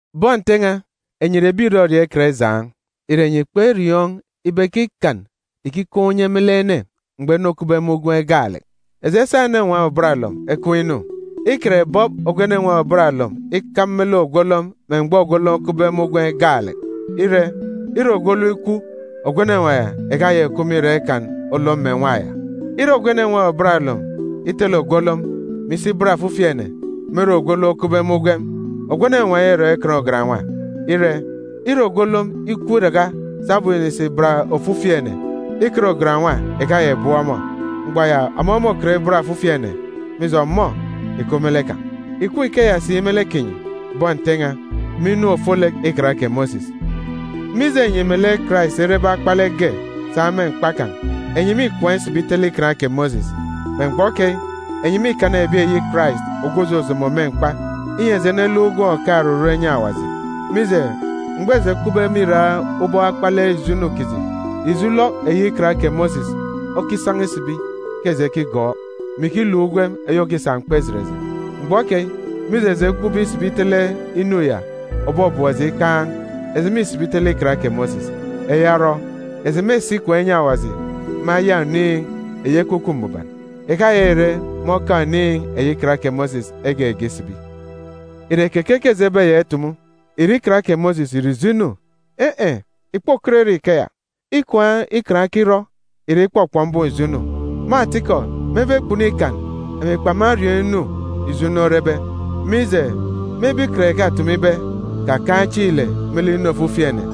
Bọn Nte n̄a, enyi ìre ebi ìrọriọọn̄ ikan ijaan̄. Ìre enyi kperiọọn̄ ibe ke ikan ìkikaan̄ unye me lek ene mgbọ ene okupbe me ugwem gaalek? Eji esa enenwaan̄ òbat olom ekween̄ inu. Ikan ìbọp ogwu enenwaan̄ òbat olom ikam me lek ogwu olom me mgbọ ogwu olom okupbe me ugwem gaalek. Ire, ire ogwu olom ikwu, ogwu enenwaan̄ ya ìkayaka ìkup me irak ikan olom mè nwa ya. Ire ogwu enenwaan̄ òbat olom itele ogwu olom, mè isi ibat ofifi ene, me ere ogwu olom okupbe me ugwem, ogwu enenwaan̄ ya îrọn̄ ikan òsi-ugan. Ire, ire ogwu olom ikwu iraka sabum înisi ibat ofifi ene, ikan òsi-ugan ìkayaka ìbọp ọmọ. Mgbọ ya, ọmọ môkọt ibat ofifi ene, mije, ọmọ ìkup me lek kan̄. Ìkup ikeya si me lek kinyi, bọn Nte n̄a, me inu ofolek Ikan kè Mosis. Mije enyi melek Karais erebe akpalek ge sa me mkpa kan̄, enyi mîkwaan̄ isibi itele Ikan kè Mosis. Me mgbọ keyi, enyi mîkana ebi eyi Karais ogwu òjojomo me mkpa, inyi eji eneluk ugwem òkaan̄ oruru enyi Awaji. Mije, mgbọ eji ekupbe me irak ubọk akpalek ijo inu kiji, ijo ulọk eyi Ikan kè Mosis okisan̄a isibi ke eji ekigọọk, mè ikiluk ugwem eyi òkisa mkpa ijet eji. Mgbọ keyi, mije eji ekwaan̄be isibi itele inu ya òbọbọp eji ikaan̄, eji mîsibi itele Ikan kè Mosis. Eya orọ, eji mêsi ikwaan̄ inyi Awaji me aya oniin̄ eyi Ekwukwu Mbuban, ìkayaka ìre me oka oniin̄ eyi Ikan kè Mosis egege isibi. Ìre keke ke eji ebeyaka itumu? Ìre Ikan kè Mosis ìre ijo inu? In̄-in̄, ìkpokọt ire ikeya! Ikwaan̄ Ikan okirọ ìre ikpọkpọk mbum ijo inu. Me atikọ, mebe kpunu Ikan, emi kpamariọọn̄ inu ijo inu orebe. Mije, mebe Ikan ìkatumu ibe, “Kakaan̄ ijo ulọk me lek inu ofifi ene,”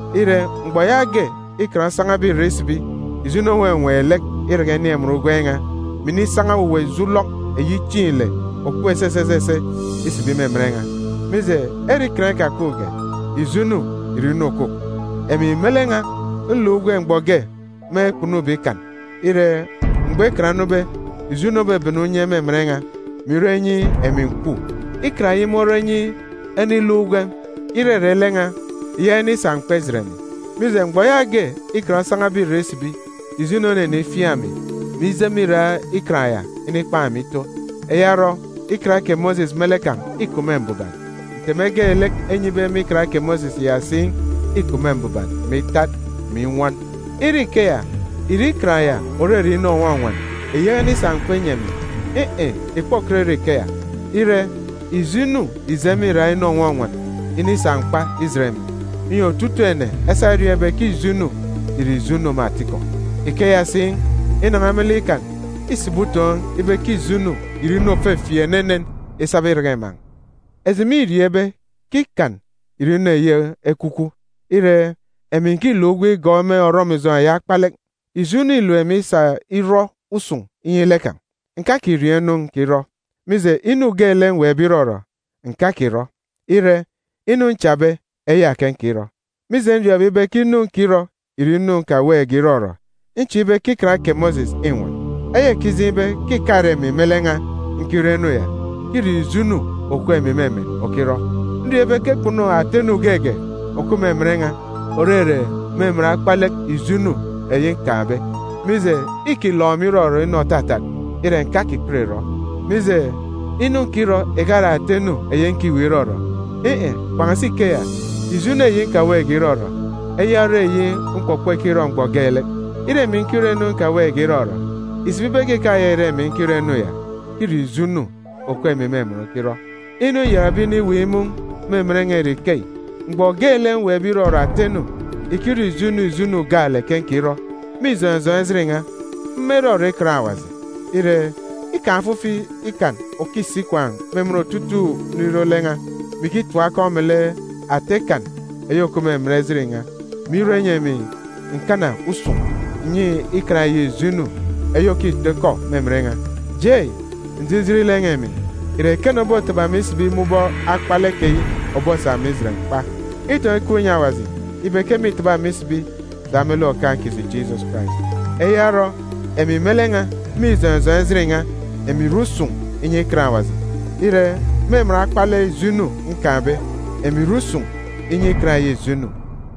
Ire, mgbọ yaage Ikan osan̄abe irek isibi, ijo inu onwenween̄ lek iraka inin̄ emen ugwem n̄a, mè inisan̄a owuwa ijo ulọk eyi chieen̄ ile òkup esese esese isibi me emen n̄a. Mije, ere ikan ikakupge, ijo inu ìre inu òkwukwu. Emi me lek n̄a, nluk ugwem mgbọ ge me kpunube ikan. Ire, mgbọ ikan onube, ijo inu obebene unye me emen n̄a, mè irọ inyi emi ǹkwu. Ikan eyi morọ inyi ene iluk ugwem, irere lek n̄a, ìyaka inisa mkpa ijet emi. Mije, mgbọ yaage ikan osan̄abe irek isibi, ijo inu onenifiaan̄ emi, mè ije me irak ikan ya inikpan̄ emi ito. Eya orọ, Ikan kè Mosis me lek kan̄ îkup me mbuban, nteme geelek enyibe me Ikan kè Mosis ya si îkup me mbuban, mè itat, mè inwọn. Ire ikeya, ìre Ikan ya òrere inu ònwọnwọn ìyaka inikana mkpa inyi emi ni? In̄-in̄, ìkpokọt ire ikeya! Ire, ijo inu ìje me irak inu ònwọnwọn inisa mkpa ijet emi, inyi otutuuk ene esa eriọọn̄ ibe ke ijo inu ìre ijo inu me atikọ. Ikeya si, inan̄a me lek ikan, îsibi utoon̄ ibe ke ijo inu ìre inu òfefieek enenen isaba iraka iman̄. Eji mîriọọn̄ ibe ke Ikan ìre inu eyi ekwukwu. Ire, emi ǹkiluk ugwem igọọk me orọmijọn̄ eyi akpalek. Ijo inu îlep emi isa irọ usun̄ inyi lek kan̄. Ǹkakiriọọn̄ inu nkirọ. Mije, inu geelek mweekbe irọrọ, ǹkakirọ. Ire, inu nchabe, eya ke nkirọ. Mije nriọọn̄be ibe ke inu nkirọ ìre inu nkaweekge irọrọ, nchieek ibe ke Ikan kè Mosis înwọn. Eya ìkijeen̄ ibe ke ìkare emi me lek n̄a nkirọ inu ya; ke îre ijo inu òkup emi me emen okirọ. Nriọọn̄ ibe ke kpunu ata inu geege òkup me emen n̄a, òrere me emen akpalek ijo inu eyi nkaan̄be. Mije, îkilọk emi irọrọ inu òtatat, ire, ǹkakikọt ìrọ. Bak me lek, inu nkirọ ìkare ata inu eyi nkiweek irọrọ. In̄-in̄, kpan̄asi ikeya, ijo inu eyi nkaweekge irọrọ, eya ore inu mkpọkpọ ikirọ mgbọ geelek. Ire emi nkirọ inu nkaweekge irọrọ, ìsibi ibe ke ìkayaka ìre emi nkirọ inu ya; ke îre ijo inu òkup emi me emen okirọ. Inu nyakabe iniweek imun̄ me emen n̄a ìre ikeyi: Mgbọ geelek mweekbe irọrọ ata inu, ìkire ijo inu ijo inu gaalek ke nkirọ. Me ijọn̄ ijọn̄ ejit n̄a, mma irọrọ Ikan Awaji. Ire, îkaan̄ ofifi ikan òkisi ikwaan̄ me emen otutuuk nriro lek n̄a, mè ikitim akọn̄ me lek ata ikan eyi òkup me emen ejit n̄a, mè irọ inyi emi ǹkana usun̄ ǹnyi ikan eyi ijo inu eyi òkitọ ikọ me emen n̄a. Jei, njijin lek n̄a îmin! Ìre ekene obotaba emi isibi me ubọk akpalek keyi òbosa emi ijet mkpa? Itọn̄ ikup inyi Awaji ibe ke mîtaba emi isibi sa me lek Okaan̄ kiji Jisọs Karais! Eya orọ, emi me lek n̄a, me ijọn̄ ijọn̄ ejit n̄a, emi ìre usun̄ inyi Ikan Awaji. Ire, me emen akpalek ijo inu nkaan̄be, emi ìre usun̄ inyi ikan eyi ijo inu.